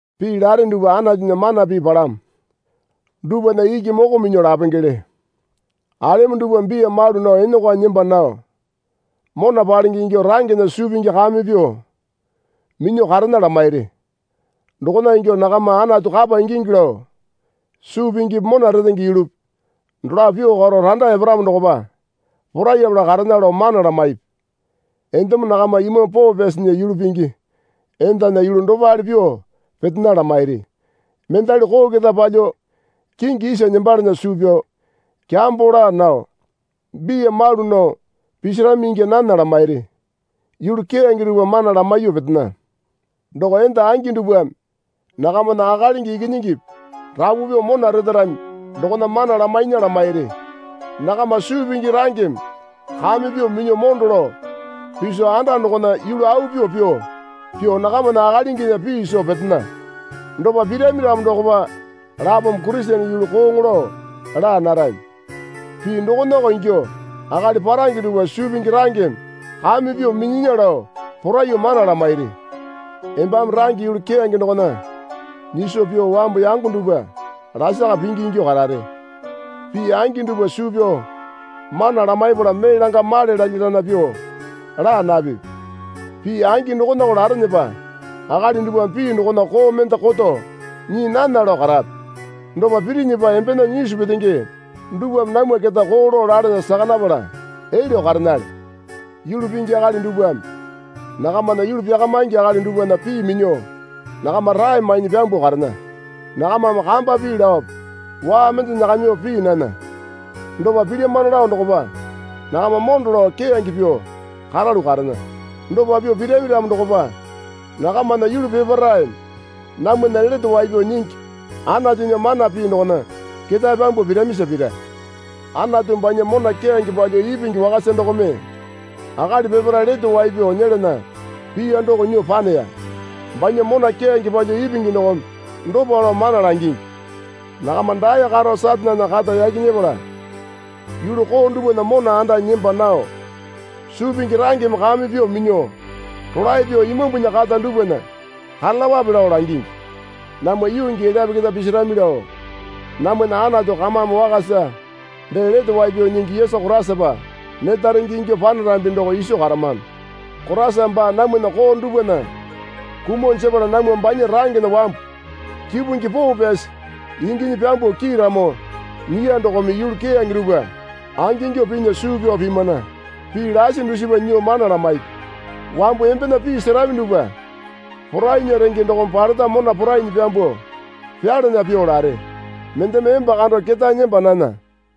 Pii lare dupwa Anatunya mana pii palamo dupwana iki moko minyuo lapengele. Alemo dupwa biya malu nao enokwanyi nemba nao mona palenge ingyuo rangena suu pingi kame pyuo minyuo karena lamairi. Dokona ingyuo nakama Anatu kapa ingingi lao suu pingipi mona retenge yulupi dolapo pyuo karo randa eparamo dokopa porayapala karena lao mana lamaipi. Endemo nakama Imambu Poo Pyasinya yulu pingi endana yulu dopale pyuo petena lamairi. Mendali koo keta palyuo kingi isa nembalana suu pyao kyambo laa nao biya malu nao pisarami ingya nana lamairi. Yulu keyange dupwa mana lamaiyuo petena. Doko enda angi dupwame nakamana akalingi ikinyingipi rapu pyuo mona retarami dokona mana lamainya lamairi. Nakama suu pingi rangeme kame pyuo minyuo mondo lao piso anda dokona yulu au pyuo pyuo nakamana akalinginya pii soo petena. Dopa pirami ramo dokopa lapome Kurisene yulu kooŋo lao laa narami. Pii dokonako ingyuo akali parange dupwa suu pingi rangeme kame pyuo minyinya lao poraiyuo mana lamairi. Embame range yulu keyange dokona nyiso pyuo wambu yango dupwa lasaka pingi ingyuo karare. Pii angi dupwa suu pyao mana lamaipala mee langa male lalya lana pyuo laa napipi. Pii angi dokonako larenepa akali dupwame pii dokona koo mende koto nyii nana lao karape. Dopa pirinyipa embena nyisu petenge dupwame namwa keta koo lao lalana saka napala elyuo karenale. Yulu pingi akali dupwame nakamana yulu pyakamingi akali dupwana pii minyuo nakama rae mainyi pyambuo karena. Nakamame kamba pii laope waa mende nyakamiwape pii nana. Dopa pilyamano lao dokopa nakama mondo lao keyange pyuo karalu karena. Dopa pyuo pirami ramo dokopa nakamana yulu peparaeme namwana Lete Wai Pyao Nyingi Anatunya mana pii dokona ketae pyambuo piramisa pira. Anatu banya mona keyange palyuo ipingi wakasa dokome akali peparae lete wai pyao nyelana piya doko nyuo paneya. Banya mona keyange palyuo ipingi dokome dopa lao mana langingi. Nakama dae karo Satanena kata yaki nyepala yulu koo dupwana mona andanyi nemba nao suu pingi rangeme kame pyuo minyuo rolae pyuo Imambunya kata dupwana karalapape lao langingi. Namwa yuu gii elyape keta pisarami lao namwana Anatu kamame wakasa dee Lete Wai Pyao Nyingi Yesu Koraisapa neta renge ingyuo panarambi doko iso karamano. Koraisame baa namwana koo dupwana kumuo jepala namwa baa rangena wambu kipungi poo pyasi inginyi pyambuo kiiramo nyiya dokome yulu keyange dupwa angingyuo pinya suu pyao pimana. Pii lasi dusipa nyuo mana lamaipi. Wambu embena pii serami dupwa porainya renge dokome paleta mona porainyi pyambuo pyalana pyuo lare. Mendeme emba kando ketae nemba nana.